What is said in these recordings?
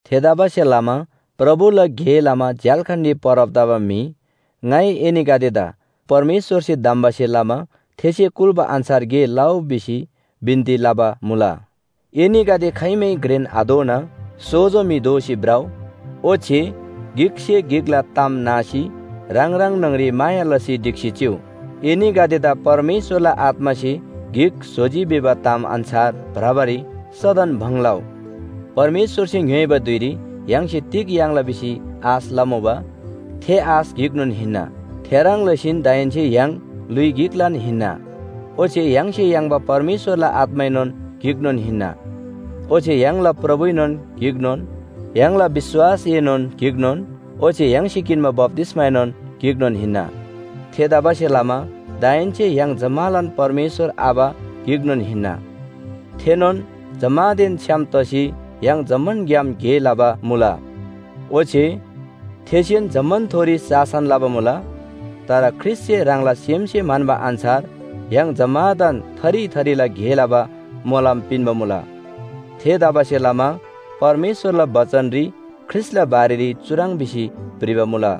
थेतबासेलमा प्रभुला गे लमा झ्‍याल्‍खानरी परब तबा म्‍हि, ङाइ एनीगदेदा परमेश्‍वरसे धम्‍बासे लमा थेसे कुल्‍बा अन्‍छार गे लउ भिसी बिन्‍ती लबा मुला। एनीगदे खाइमै घ्रेन आदोना सोजो म्‍हि दोसी भ्रउ। ओच्‍छे गिकसे गिकला ताम नासी ह्राङ ह्राङ न्‍हङरी माया लसी ढिक्‍सी चिउ। एनीगदेदा परमेश्‍वरला आत्‍मासे गिक स्‍होजी भिबा ताम अन्‍छार भ्रबारी सदन भङ लउ। परमेश्‍वरसे ङ्‌योइबा धुइरी य्‍हाङसे तिग याङ्ला भिसी आश लमुबा, थे आश गिकनोन हिन्‍ना। थेह्रङ् लसीन दाहेन्‍से य्‍हाङ ल्‍हुइ गिकलान हिन्‍ना। ओच्‍छे य्‍हाङसे याङ्बा परमेश्‍वरला आत्‍माएनोन गिकनोन हिन्‍ना। ओच्‍छे य्‍हाङला प्रभुएनोन गिकनोन, य्‍हाङला विश्‍वासएनोन गिकनोन ओच्‍छे य्‍हाङसे किन्‍बा बप्‍तिस्‍माएनोन गिकनोन हिन्‍ना। थेतबासेलमा दाहेन्‍से य्‍हाङ जम्‍मालान परमेश्‍वर आबा गिकनोन हिन्‍ना। थेनोन जम्‍मानदेन छ्‌याम तसी य्‍हाङ जम्‍मानग्‍याम गे लबा मुला। ओच्‍छे थेसेन जम्‍मानथोरी शासन लबा मुला। तर ख्रीष्‍टसे ह्राङला सेमसे म्‍हन्‍बा अन्‍छार य्‍हाङ जम्‍मादान थरी थरीला गे लबा मोलम पिन्‍बा मुला। थेतबासेलमा परमेश्‍वरला बचनरी ख्रीष्‍टला बारेरी चुह्रङ् भिसी भ्रिबा मुला,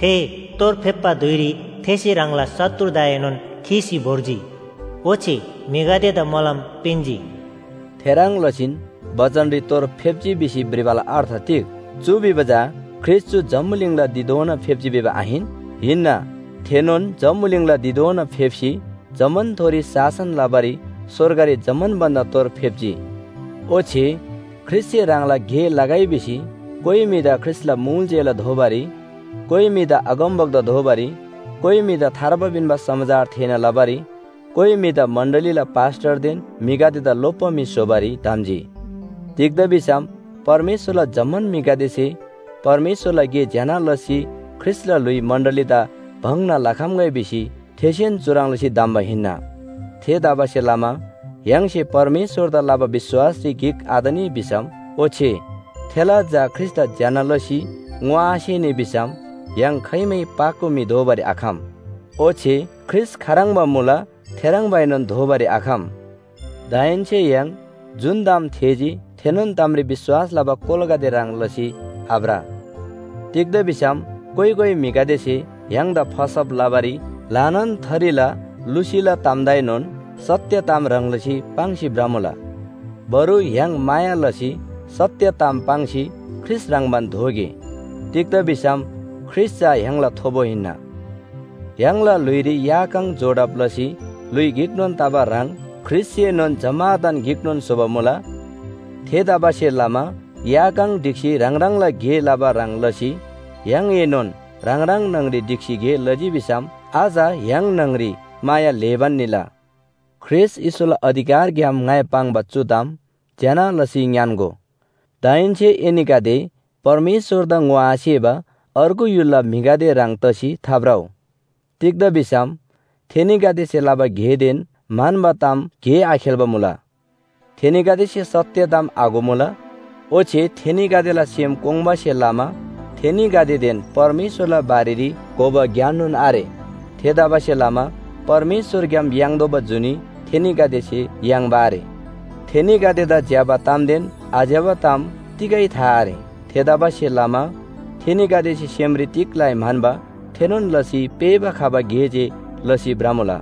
“थे तोर फेप्‍बा धुइरी थेसे ह्राङला शत्रुदाएनोन खीसी भोर्जी। ओच्‍छे म्‍हिगदेदा मोलम पिन्‍जी।” थेह्रङ् लसीन बचनरी तोर फेप्‍जी भिसी भ्रिबाला अर्थ तिग? चु भिबा चा ख्रीष्‍ट चु जम्‍बुलिङला धिधोना फेप्‍जी भिबा आहिन? हिन्‍ना। थेनोन जम्‍बुलिङला धिधोना फेप्‍सी जम्‍मानथोरी शासन लबारी स्‍वर्गरी जम्‍मान भन्‍दा तोर फेप्‍जी। ओच्‍छे ख्रीष्‍टसे ह्राङला गे लगै भिसी कोइ म्‍हिदा ख्रीष्‍टला मुल चेला दोबारी, कोइ म्‍हिदा अगमवक्ता दोबारी, कोइ म्‍हिदा थार्बा पिन्‍बा समाचार थेःना लबारी, कोइ म्‍हिदा मण्‍डलीला पास्‍टरदेन म्‍हिगदेदा लोप्‍बा म्‍हि स्‍होबारी धम्‍जी। तिग्‍दा भिसम परमेश्‍वरला जम्‍मान म्‍हिगदेसे परमेश्‍वरला गे ज्‍यना लसी ख्रीष्‍टला ल्‍हुइ मण्‍डलीदा भङ्‍ना लखम्‍गै भिसी थेसेन चुह्रङ् लसी धम्‍बा हिन्‍ना। थेतबासेलमा य्‍हाङसे परमेश्‍वरदा लबा विश्‍वासरी गिक आतनी भिसम ओच्‍छे थेला झा ख्रीष्‍टदा ज्‍यना लसी ङोआसेनी भिसम य्‍हाङ खाइमै पाको म्‍हि दोबारी आखम। ओच्‍छे ख्रीष्‍ट खाह्रङ्बा मुला थेह्रङ्बाएनोन दोबारी आखम। दाहेन्‍से य्‍हाङ जुन ताम थेःजी थेनोन तामरी विश्‍वास लबा कोलागदे ह्रङ् लसी आभ्र। तिग्‍दा भिसम कोइ कोइ म्‍हिगदेसे य्‍हाङदा फसब लबारी ल्‍हानान थरीला लुसीला तामदाएनोन सत्‍य ताम ह्रङ् लसी पाङ्सी भ्रमुला। बरु य्‍हाङ माया लसी सत्‍य ताम पाङ्सी ख्रीष्‍ट ह्रङ्‌बान दोगे। तिग्‍दा भिसम ख्रीष्‍ट चा य्‍हाङला थोबो हिन्‍ना। य्‍हाङला ल्‍हुइरी या काङ जोडब लसी ल्‍हुइ गिकनोन तबा ह्रङ् ख्रीष्‍टसेनोन जम्‍मादान गिकनोन स्‍होबा मुला। थेतबासेलमा या काङ ढिक्‍सी ह्राङ ह्राङला गे लबा ह्रङ् लसी य्‍हाङएनोन ह्राङ ह्राङ न्‍हङरी ढिक्‍सी गे लजी भिसम अझ य्‍हाङ न्‍हङरी माया ल्‍हेबान निला। ख्रीष्‍ट येशूला अधिकारग्‍याम ङाइ पाङ्बा चु ताम ज्‍यना लसी ङ्‌यान्‍गो। दाहेन्‍से एनीगदे परमेश्‍वरदा ङोआसेबा अर्गु य्‍हुलला म्‍हिगदे ह्रङ् तसी थाभ्रउ। तिग्‍दा भिसम थेनीगदेसे लबा गेदेन म्‍हन्‍बा ताम गे आखेल्‍बा मुला। थेनीगदेसे सत्‍य ताम आघोमुला ओच्‍छे थेनीगदेला सेम कोङ्बासे लमा थेनीगदेदेन परमेश्‍वरला बारेरी घोबा ज्ञाननोन आरे। थेतबासेलमा परमेश्‍वरग्‍याम याङ्तोःबा जुनी थेनीगदेसे याङ्बा आरे। थेनीगदेदा ज्‍यबा तामदेन आज्‍यबा ताम तिगै था आरे। थेतबासेलमा थेनीगदेसे सेमरी तिग लइ म्‍हन्‍बा थेनोन लसी पेःबा खबा गे जे लसी भ्रमुला।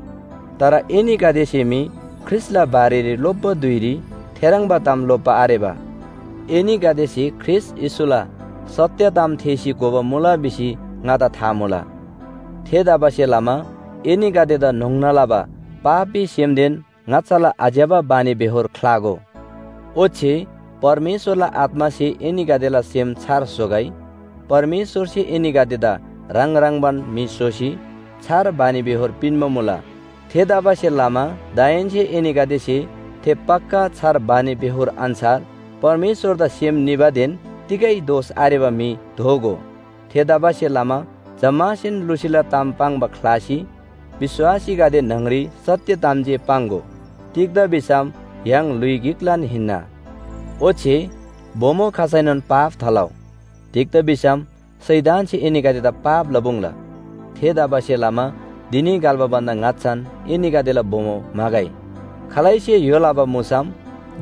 तर एनीगदेसे मी ख्रीष्‍टला बारेरी लोप्‍बा धुइरी थेह्रङ्बा ताम लोप्‍बा आरेबा। एनीगदेसे ख्रीष्‍ट येशूला सत्‍य ताम थेःसी घोबा मुला भिसी ङादा था मुला। थेतबासेलमा एनीगदेदा न्‍होङ्ना लबा पापी सेमदेन ङाच्‍छाला आज्‍यबा बानीबेहोर ख्‍लागो। ओच्‍छे परमेश्‍वरला आत्‍मासे एनीगदेला सेम छार स्‍होगै। परमेश्‍वरसे एनीगदेदा ह्राङ ह्रङ्‌बान म्‍हि स्‍होसी छार बानीबेहोर पिन्‍बा मुला। थेतबासेलमा दाहेन्‍से एनीगदेसे थे पक्‍का छार बानीबेहोर अन्‍छार परमेश्‍वरदा सेम निबादेन तिगै दोष आरेबा म्‍हि दोगो। थेतबासेलमा जम्‍मासेन लुसीला ताम पाङ्बा ख्‍लासी विश्‍वासीगदे न्‍हङरी सत्‍य ताम जे पाङ्‍गो। तिग्‍दा भिसम य्‍हाङ ल्‍हुइ गिकलान हिन्‍ना। ओच्‍छे बोमो खसैनोन पाप थालउ। तिग्‍दा भिसम शैतानसे एनीगदेदा पाप लपुङ्ला। थेतबासेलमा धिनी घल्‍बा भन्‍दा ङाच्‍छान एनीगदेला बोमो म्‍हागै। खालैसे य्‍हो लबा मुसम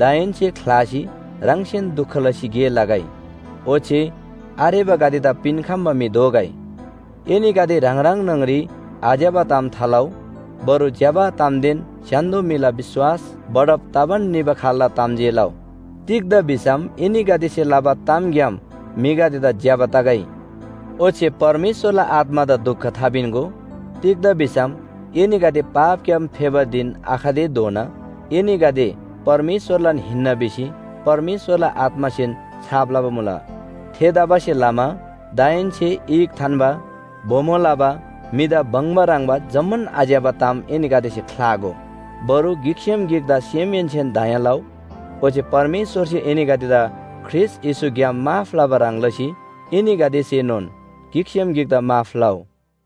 दाहेन्‍से ख्‍लासी ह्राङसेन दुख लसी गे लगै, ओच्‍छे आरेबागदेदा पिन्‍खम्‍बा म्‍हि दोगै। एनीगदे ह्राङ ह्राङ न्‍हङरी आज्‍यबा ताम थालउ। बरु ज्‍यबा तामदेन स्‍य्‍हान्‍दो म्‍हिला विश्‍वास बढब तबान निबा खाल्‍ला ताम जे लउ। तिग्‍दा भिसम एनीगदेसे लबा तामग्‍याम म्‍हिगदेदा ज्‍यबा तगै। ओच्‍छे परमेश्‍वरला आत्‍मादा दुख थापिन्‍गो। तिग्‍दा भिसम एनीगदे पापग्‍याम फेबा धिन आखतेधोना एनीगदे परमेश्‍वरलान हिन्‍ना भिसी परमेश्‍वरला आत्‍मासेन छाप लबा मुला। थेतबासेलमा दाहेन्‍से ईख थान्‍बा, बोमो लबा, म्‍हिदा बङ्बा ह्रङ्‌बा जम्‍मान आज्‍यबा ताम एनीगदेसे ख्‍लागो। बरु गिकसेम गिकदा सेमहेन्‍सेन दया लउ। ओच्‍छे परमेश्‍वरसे एनीगदेदा ख्रीष्‍ट येशूग्‍याम माफ लबा ह्रङ् लसी एनीगदेसेनोन गिकसेम गिकदा माफ लउ।